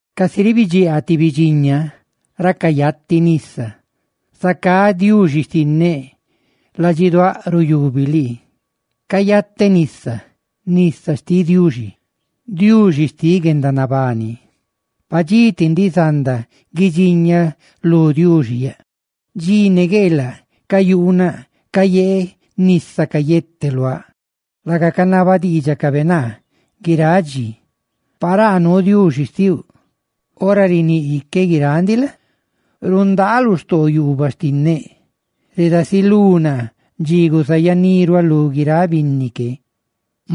Casi ribidxiaa ti bidxiña ra cayati nisa, zacá, Diuxi xtinneꞌ, ladxiduáꞌ ruyubi lii. Cayateꞌ nisa, nisa xtiꞌ Diuxi, Diuxi xtiꞌ guendanabani. Padxí ti ndiꞌ zanda guidxiñaꞌ lú Diuxi yaꞌ. Dxi ne gueelaꞌ, cayuunaꞌ cayeeꞌ nisa cadá luáꞌ, laga canaba diidxacabe naa guiráꞌ dxi: «Paraa nuu Diuxi xtiuꞌ.» Ora riníꞌ iqueꞌ guiráꞌ ndiꞌ la? rundaaꞌ lu xtoo yuubaꞌ xtinneꞌ. Redasilú naa dxi guzayaniruáꞌ lu guiráꞌ binni que,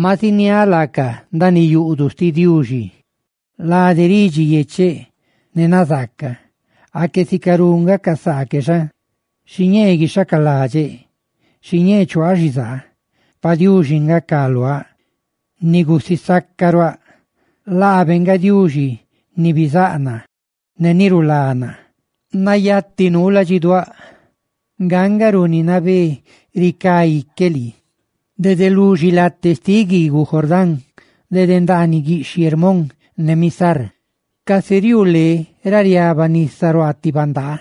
ma ziniáꞌ laacaꞌ ndaaniꞌ yuꞌduꞌ xtiꞌ Diuxi lade ridxi yecheꞌ ne nazaaca. ¡Aque sicarú nga ca saa que xa! Xiñee guixhacaladxeꞌ. Xiñee chuaaꞌ xizaa. Pa Diuxi nga ca luáꞌ, ni gusisacaruáꞌ. ¡Laabe nga Diuxi ni bizáꞌ naa ne ni rulá naa! Nayati nuu ladxiduáꞌ. Nga nga runi nabé ricá ique lii dede lu xilatea xtiꞌ guiiguꞌ Jordán, dede ndaaniꞌ guiꞌxhiꞌ Hermón ne Misar. Casi riuu lé ra riaba nisa ruaa ti bandaa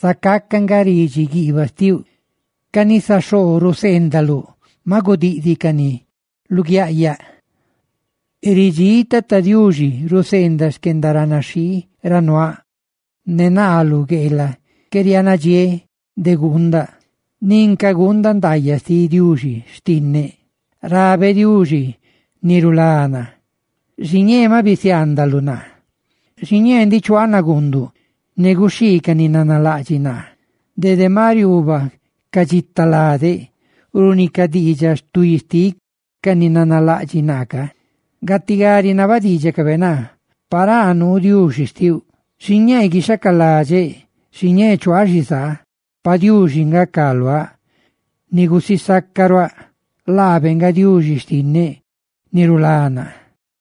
zacaca nga ridxi guiibaꞌ xtiuꞌ; ca nisa xoo ruseendaluꞌ maꞌ gudidíꞌcani luguiaꞌyaꞌ. Ridxíꞌ Tata Diuxi ruseendaꞌ xquendaranaxhii ra nuaaꞌ, ne naa lu gueelaꞌ qué riaanadxiéꞌ de guundaꞌ nin ca guundaꞌ ndaayaꞌ xtiꞌ Diuxi xtinneꞌ. Rabeꞌ Diuxi, ni rulá naa: «Xiñee maꞌ bisiaandaluꞌ naa. Xiñee ndiꞌ chuaaꞌ naguunduꞌ ne guxhii ca ni nanalaꞌdxiꞌ naa ca naa.» Dede maꞌ riuubaꞌ ca dxita ladeꞌ runi ca diidxaꞌ stuí xtiꞌ ca ni nanalaꞌdxiꞌ naa ca, gatigá rinaba diidxacabe naa: «Paraa nuu Diuxi xtiuꞌ.» Xiñee guixhacaladxeꞌ. Xiñee chuaaꞌ xizaa. Pa Diuxi nga ca luáꞌ, ni gusisacaruáꞌ. ¡Laabe nga Diuxi xtinneꞌ, ni rulá naa!